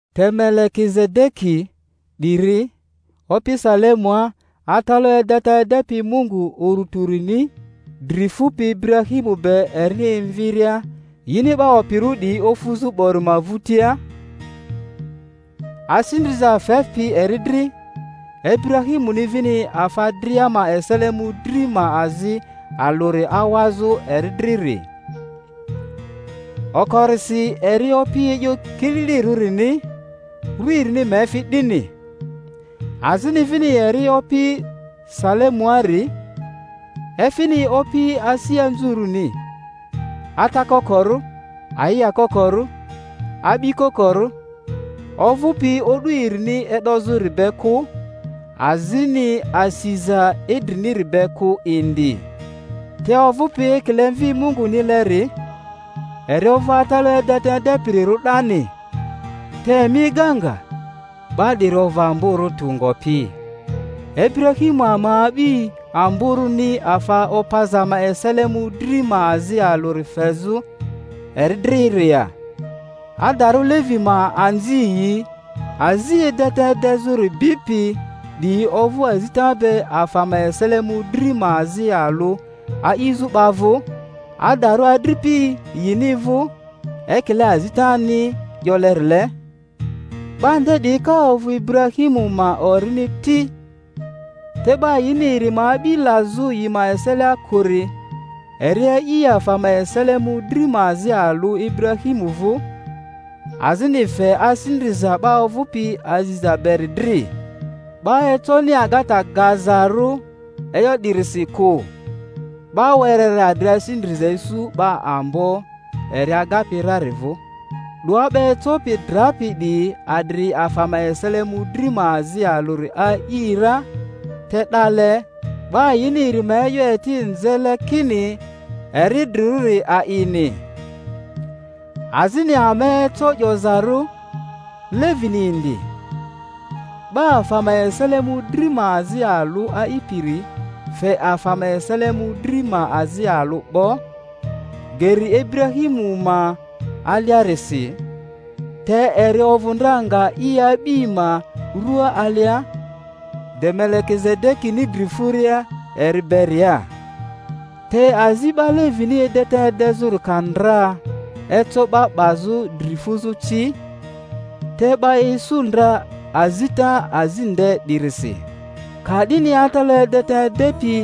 Te Melekizedeki 'diri, opi Salemua, atalaᴜ edeta edepi Mungu Urᴜ Tᴜrini, dri fupi Iburahimu be erini emviria yini 'ba opirᴜ 'diyi ofuzᴜ 'bori ma vᴜtia, asi ndriza fepi eri dri, Iburahimuni vini afa dria ma esele mᴜdri ma azi alᴜri awazᴜ eri driri. Okorisi eri opi e'yo kililirᴜrini (ru erini ma efi 'dini) azini vini eri opi Salemuari, efini opi asi anzurᴜni; ata kokorᴜ, ayia kokorᴜ, a'bi kokorᴜ, ovᴜpi o'du erini e'dozᴜri be kᴜ, azini asiza idriniri be kᴜ indi, te ovᴜpi ekile Mvi Mungunileri, eri ovᴜ atalaᴜ edeta edepirirᴜ 'dani. Te emi ega nga, 'ba 'diri ovᴜ amborᴜ tᴜ ngopi, Iburahimu ama a'bi amborᴜni afa opaza ma esele mᴜdri ma azi alᴜri fezᴜ eri driri ya! Adarᴜ Levi ma anziyi azi edeta edezᴜri bipi 'diyi ovᴜ azita be afa ma esele mᴜdri ma azi alᴜ a'izᴜ 'ba vᴜ, adarᴜ adripi yini vᴜ, ekile azitani 'yolerile, 'ba nde 'diyi ka ovᴜ Iburahimu ma orini ti. Te 'ba yini eri ma a'bi lazᴜ yi ma eselia kᴜri, eri a'i afa ma esele mᴜdri ma azi alᴜ Iburahimu vᴜ, azini fe asi ndriza 'ba ovᴜpi aziza beri dri. 'Ba econi agata gazarᴜ e'yo 'dirisi kᴜ, 'ba wereri adri asi ndriza isu 'ba ambo eri agapi rari vᴜ. 'Doa 'ba ecopi drapi 'diyi adri afa ma esele mᴜdri ma azi alᴜri a'i ra; te 'dale, 'ba yini eri ma e'yo eti nzele kini eri idrirᴜri a'ini. Azini ama eco 'yozarᴜ, Levini indi, 'ba afa ma esele mᴜdri ma azi alᴜ a'ipiri fe afa ma esele mᴜdri ma azi alᴜ 'bo, geri Iburahimu ma aliarisi; te eri ovᴜ ndra nga i a'bi ma rua alia, de Melekizedekini dri furia eri beria. Te azi 'ba Levini edeta edezᴜri ka ndra eco 'ba 'bazᴜ dri fuzᴜ ci (te 'ba isu ndra azita azi nde 'dirisi), ka'dini atalaᴜ edeta edepi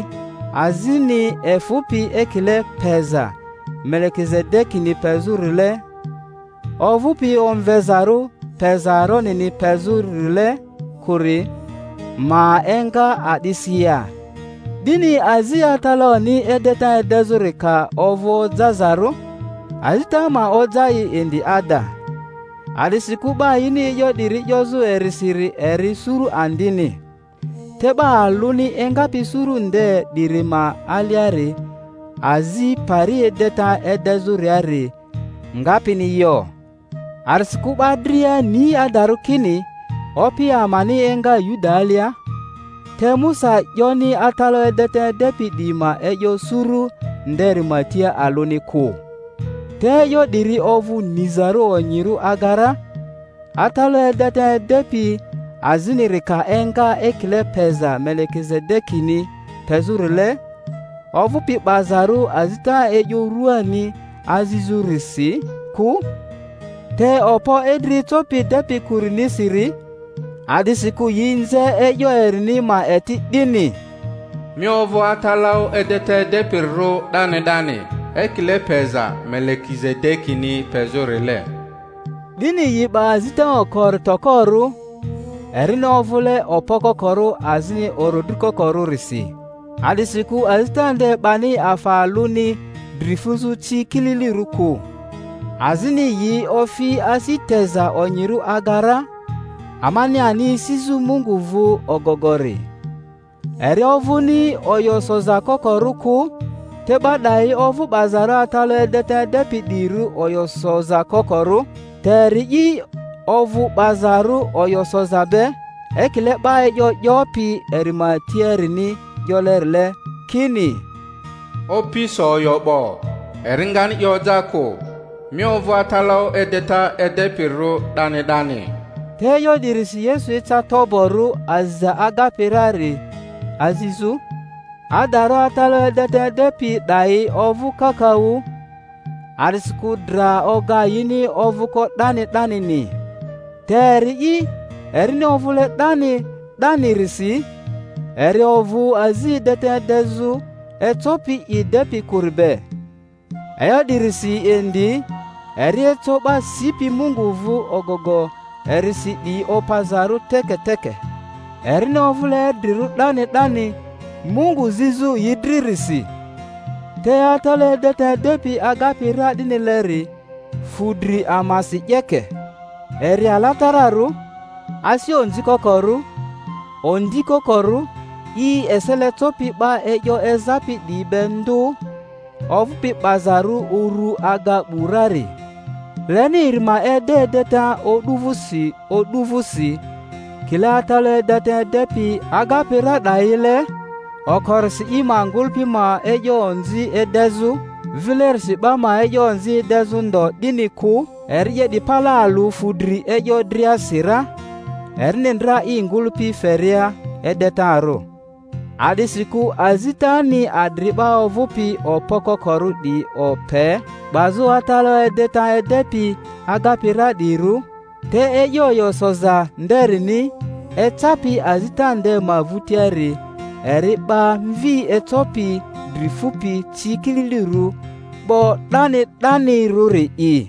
azini efᴜpi ekile peza Melekizedekini pezᴜrile, ovᴜpi omvezarᴜ peza Aronini pezᴜ-rile kᴜri ma enga a'disi ya? 'Dini azi atalaᴜni edeta edezᴜri ka ovᴜ ojazarᴜ, azita ma oja i indi ada. A'disikᴜ 'ba yini e'yo 'diri 'yozᴜ erisiri eri suru andini, te 'ba alᴜni engapi suru nde 'diri ma aliari azi pari edeta edezᴜriari ngapini yo. A'disikᴜ 'ba dria ni adarᴜ kini Opi amani enga Yuda alia; te Musa 'yoni atalaᴜ edeta edepi 'diyi ma e'yo suru nderi ma tia alᴜni kᴜ. Te e'yo 'diri ovᴜ nizarᴜ onyirᴜ aga ra, atalaᴜ edeta edepi aziniri ka enga ekile peza Melekizedekini pezᴜrile, ovᴜpi 'bazarᴜ azita e'yo rᴜani azizᴜrisi kᴜ, te okpo idri ecopi depi kᴜrinisiri. A'disikᴜ yi nze e'yo erini ma eti 'dini, Mi ovᴜ atalaᴜ edeta edepirirᴜ 'dani 'dani, ekile peza Melekizedekini pezᴜ-rile. 'Dini yi 'ba azita okori tokorᴜ erini ovᴜle okpo kokorᴜ azini orodri kokorᴜrisi (a'disikᴜ azita nde 'bani afa alᴜni dri fuzᴜ ci kililirᴜ kᴜ); azini yi ofi asi teza onyirᴜ aga ra, amani ani esizᴜ Mungu vᴜ ogogori. Eri ovᴜni oyo soza kokorᴜ kᴜ. Te 'ba 'dayi ovᴜ 'bazarᴜ atalaᴜ edeta edepi 'diyirᴜ oyo soza kokorᴜ, te eri'i ovᴜ 'bazarᴜ oyo soza be, ekile 'ba e'yo 'yopi eri ma tiarini 'yolerile, kini, Opi so oyo 'bo, eri ngani i oja kᴜ, Mi ovᴜ atalaᴜ edeta edepirirᴜ 'dani 'dani. Te e'yo 'dirisi Yesu eca toborᴜ aziza agapi rari azizᴜ. Adarᴜ atalaᴜ edeta edepi 'dayi ovᴜ kakaᴜ, a'disikᴜ dra oga yini ovᴜko 'dani 'danini; te eri'i, erini ovᴜle 'dani 'danirisi, eri ovᴜ azi edeta edezᴜ ecopi i depi kᴜri be. E'yo 'dirisi indi eri eco 'ba sipi Mungu vᴜ ogogo erisi 'diyi opazarᴜ teke teke, erini ovᴜle idrirᴜ 'dani 'dani Mungu zizᴜ yi dririsi. Te atalaᴜ edeta edepi agapi ra 'dinileri fu dri amasi 'yeke, eri alatararᴜ, asi onzi kokorᴜ, ondi kokorᴜ, i esele copi 'ba e'yo ezapi 'diyi be ndᴜ, ovᴜpi 'bazarᴜ uru aga 'bu rari. Leni eri ma ede edeta o'du vᴜsi o'du vᴜsi, kile atalaᴜ edeta edepi agapi ra 'dayile, okorisi i ma ngᴜlᴜpi ma e'yo onzi edezᴜ, vilerisi 'ba ma e'yo onzi edezᴜ ndo, 'dini kᴜ; eri 'ye 'di pale alᴜ fudri e'yo driasi ra, erini ndra i ngᴜlᴜpi feria edetarᴜ. A'disikᴜ azitani adri 'ba ovᴜpi okpo kokorᴜ 'diyi ope 'bazᴜ atalaᴜ edeta edepi agapi ra 'diyirᴜ; te e'yo oyo soza nderini, ecapi azita nde ma vᴜtiari, eri 'ba Mvi ecopi dri fupi ci kililirᴜ 'bo 'dani 'danirᴜri'i.